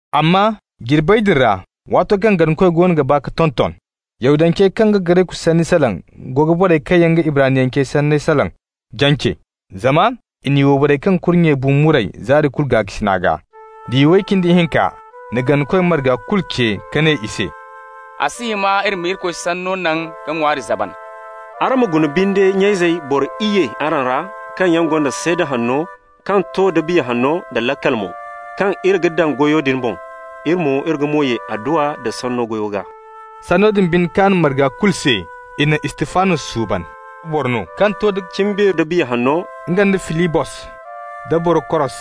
Amma jirbey din ra, waato kaŋ ganakoy goono ga baa ka tonton, Yahudancey kaŋ ga Gareku sanni salaŋ go ga borey kaŋ yaŋ ga Ibraniyancey sanni salaŋ jance, zama i n'i wayborey kaŋ kurnyey bu muray zaari kulu gaakasina gaa. Diya way cindi hinka na ganakoy marga kulu ce ka ne i se: «A si hima iri ma Irikoy Sanno naŋ ka ŋwaari zaban. Araŋ ma guna binde, nya-izey, boro iyye araŋ ra kaŋ yaŋ gonda seeda hanno, kaŋ to da Biya Hanno da laakal mo, kaŋ iri ga daŋ goyo din boŋ. Iri mo, iri ga mo ye adduwa nda Sanno goyo gaa.» Sanno din binde kaan marga borey kulu se. I na Istifanos suuban, boro no kaŋ to nda cimbeeri da Biya Hanno, nga nda Filibos, da Borokoros,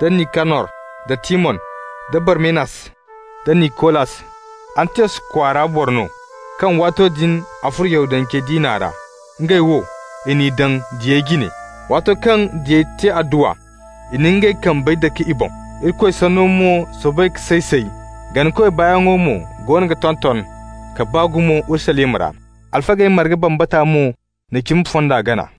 da Nikanor, da Timon, da Barmenas, da Nikolas, Antiyos kwaara boro no kaŋ waato din a furo Yahudance diina ra. Ngey wo, i n'i daŋ diyey jine. Waato kaŋ diyey te adduwa, i na ngey kambey dake i boŋ. Irikoy Sanno mo soobay ka say-say, ganakoy baayaŋ mo goono ga tonton ka baa gumo Urusalima ra. Alfagey marga bambata mo na cimi fonda gana.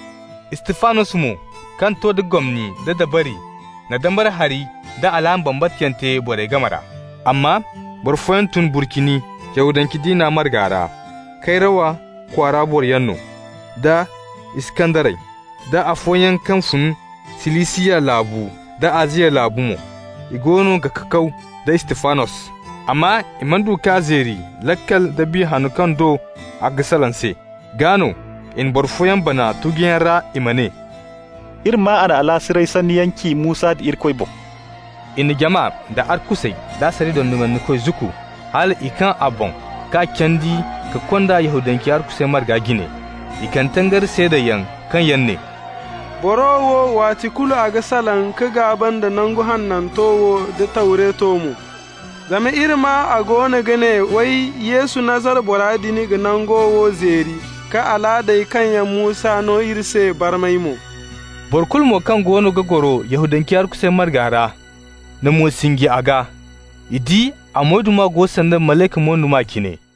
Istifanos mo, kaŋ to nda gomni da dabari, na dambara hari da alaama bambata yaŋ te borey game ra. Amma boro fooyaŋ tun Burcini Yahudance diina marga ra, Kayrawa kwaara boroyaŋ no, da Iskandarey, da afooyaŋ kaŋ fun Silisiya laabu da Aziya laabu mo. I goono ga kakaw da Istifanos. Amma i mana du k'a zeeri laakal da Biya Hanno kaŋ do a ga salaŋ se. Gaa no i na boro fooyaŋ bana tuguyaŋ ra i ma ne: «Iri maa a na alaasiray sanniyaŋ ci Musa nda Irikoy boŋ.» I na jama, da arkusey da asariya dondonandikoy zukku, hal i kaŋ a boŋ k'a candi ka kond'a Yahudancey arkusey marga jine. I kande tangari seedayaŋ kaŋ yaŋ ne: «Boro wo, waati kulu a ga salaŋ ka gaaba nda Nangu Hananto wo da Tawreto mo. Zama iri maa a goono ga ne, way, Yesu Nazara bora din ga nangu wo zeeri ka alaadey kaŋ yaŋ Musa no iri se barmay mo.» Boro kulu mo kaŋ goono ga goro Yahudancey arkusey marga ra na mo sinji a gaa. I di a moyduma go sanda malayka moyduma cine.